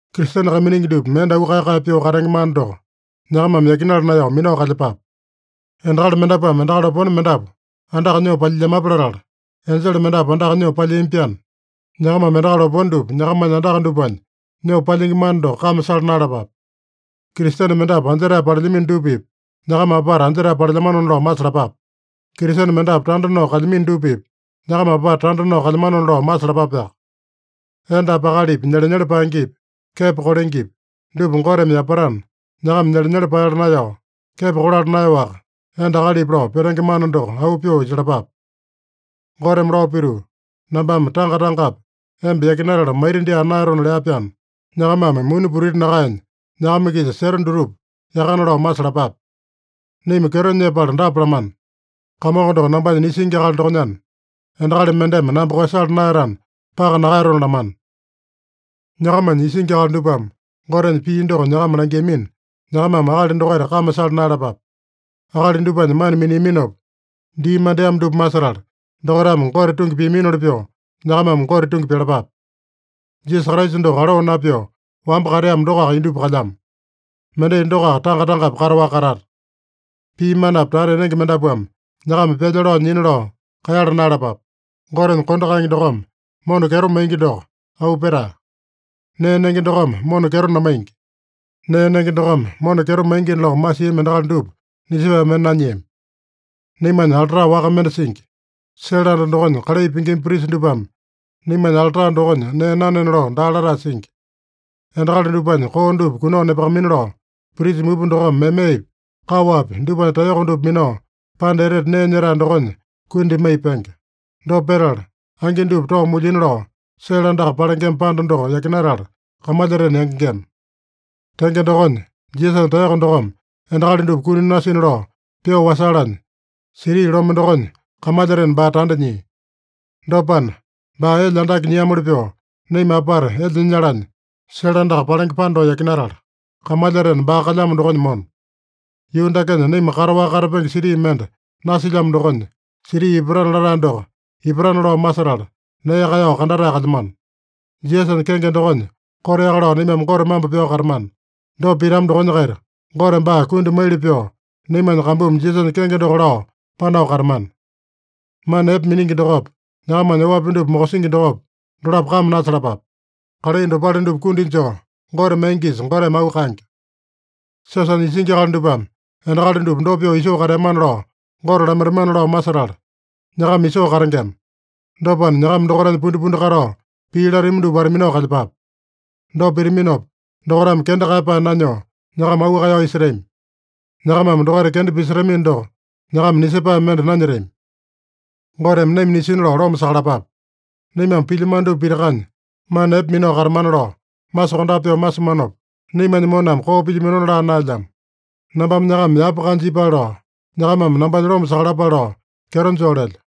Kristene kaiminingi dupa mende auu kae-kae pyoo katenge mana doko nyakamame yakinala naeyao minao kalyepape. Endakali mendapuame endakali opone mendapu andaka nyoo palyilyamape latala, enjele mendapu andaka nyoo palyiami-pyaana, nyakamame endakali opone dupa nyakamanya andaka dupanya nyoo palyingi mana doko kame sala naeyalapape. Kristene mendapu anjetae palelyamino dupa-pipa nyakama apata anjetae palelyamanona lao masalapape. Kristene mendapu tanda nao kalyamino dupa-pipa nyakama apata tanda nao kalyamanona lao masalapapeaka. Endapi akalipi nyelenyele paengepi, kepo kolengepi, dupa Goteme yapatana, nyakama nyelenyele paeyala naeyao, kepo kolala naeyaowaka, enda-akalipi lao petenge mana doko auu pyoo isalapape. Goteme lao pituu, “Nambame tanga-tangapi emba yakinatala maita dyaa naeyatona” lea-pyaana, nyakamame muni putiti nakaenya, nyakama-kisa seta dutupa yakana lao masalapape. Naima kyeto nyepala dapa lamana: “Kamongo doko nambanya nisingi akali dokonyana, endakali mendeme namba koeyasala naeyatana, paka nakaeyatona” lamana. Nyakamanya isingi akali dupame Gotenya pii doko nyakama langiamina, nyakamame akali dokaita kame sala naeyalapape. Akali dupanya mana miniaminopa dii mandeamo dupa masetala, dokaitame Gote tungi piaminoli pyoo, nyakamame Gote tungi pyalapape. Jisasa Kraisa doko aloo napyoo wamba kateamo dokoaka indupa kalyamo. Mendai dokoaka tanga-tangapi kataowaka katata. Pii manapi tata enenge mendapuame nyakama pyalya lao nyina lao kaeyala naeyalapape. Gotenya kondo kaenge dokome mona kyeto maingi doko auu petae. Nee nenge dokome mona kyeto namaingi. Nee nenge dokome mona kyeto maingina lao masiami endakali dupa nisepae mende nanyiami. Naimanya alta waka mende singi. Sele anda dokonya kalai pingima prisa dupame naimanya alta dokonya nee nanena lao daa latae singi. Endakali dupanya koo dupa kunao nepakamaina lao, prisa mupa dokome memepi, kaowapi dupanya taeyoko dupa minao, Panda Etete Nee Nyetae dokonya kundi maiya penge. Dopa petala, angi dupa tao mulyina lao sele andaka palengema panda doko yakinatala kamalyatena yangengema. Tenge dokonya, Jisasanya taeyoko dokome endakali dupa kuni nasina lao pyoo wasalanya, siti lome dokonya kamalyatena baa tanda nyia. Dopana, baa elya andake nyiamoli pyoo naima apata elya nyalanya, sele andaka palenge panda doko yakinatala, kamalyatena baa kalyamo dokonya mona. Yuu dakenya naima kataowaka katapenge siti mende nasilyamo dokonya, siti ipatana latae doko ipatana lao masetala, nee kaeyao kandatae kalyamano. Jisasanya kenge dokonya koteaka lao naimame Gote mambo pyao katamana. Dopa pitama dokonya-kaita, Gote baa kundi maili pyoo naimanya kambumi Jisasanya kenge doko lao panao katamana. Mana epe miningi dokopa, nyakamanya oapi dupa mokosingi dokopa, dolapo kame nasalapape. Kalai dopale dupa kundi joo Gote maingisa, Goteme auu kaenge. Siosanya isingi akali dupame endakali dupa dopa pyoo isoo kateamana lao, Gote lamaitamana lao masetala, nyakama isoo katengema. Dopana, nyakama dokaitanya pundipundi katao, pii latami dupa wata-minao kalyepape. Dopa pitaminopa, dokaitame kenda kaeyapae nanyoo, nyakama auu kaeyao isetami. Nyakamame dokaita kenda pisetamino doko, nyakama nisepae mende nanyetami. Goteme naima nisina lao loma sakalapape. Naimame pilyamano dupa pitakanya, mana epe minao katamana lao masokondape pyoo masimanopa, naimanya moname koo pilyaminona laa naelyamo. Nambame nyakama yapa kanja ipale lao, nyakamame nambanya loma sakalapale lao kyeto joo lelyo.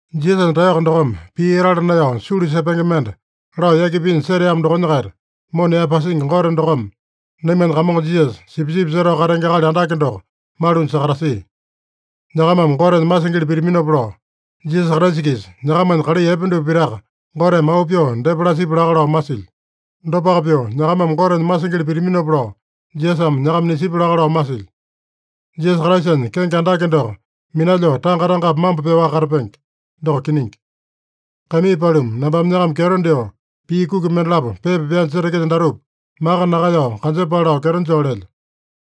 Jisasanya taeyoko dokome pii etala naeyao sulu sepenge mende lao yaki pinya seteamo dokonya-kaita, mona yaepasingi Gote dokome naimanya Kamongo Jisasa, sipisipi setao katenge akali andake doko malunya sakatasia. Nyakamame Gotenya masingili pitaminopa lao, Jisasa Kraisa-kisa nyakamanya kalai epe dupa pitaka Goteme auu pyoo depa lasipya laka lao masilyo. Dopaka pyoo nyakamame Gotenya masingili pitaminopa lao, Jisasame nyakama nisipya laka lao masilyo. Jisasa Kraisanya kenge andake doko minalyoo tanga-tangapi mambo pyaowaka katapenge. Doko kiningi. Kaimii paluma, nambame nyakama kyeto dyoo, pii kuki mendalapo pepa pyanya setekelyo datupa maka nakaeyao kanjepale lao kyeto joo lelyo.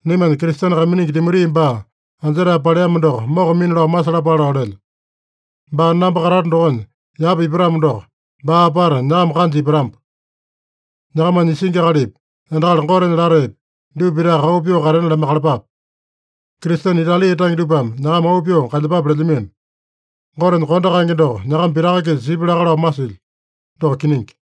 Naimanya Kristene kaiminingi Timoti baa anjetae paleamo doko mokamina lao masalapale lao lelyo. Baa namba katato dokonya yapa ipatamo doko, baa apata nyakama kanja ipatamba. Nyakamanya isingi akalipi, endakali Gotenya lataepi, dupa pitaka auu pyoo katena lamaiyakalapape. Kristene Itali tange dupame nyakama auu pyoo kalyepape lelyamino. Gotenya kondo kaenge doko nyakama pitaka-kisa sipya laka lao masilyo. Doko kiningi.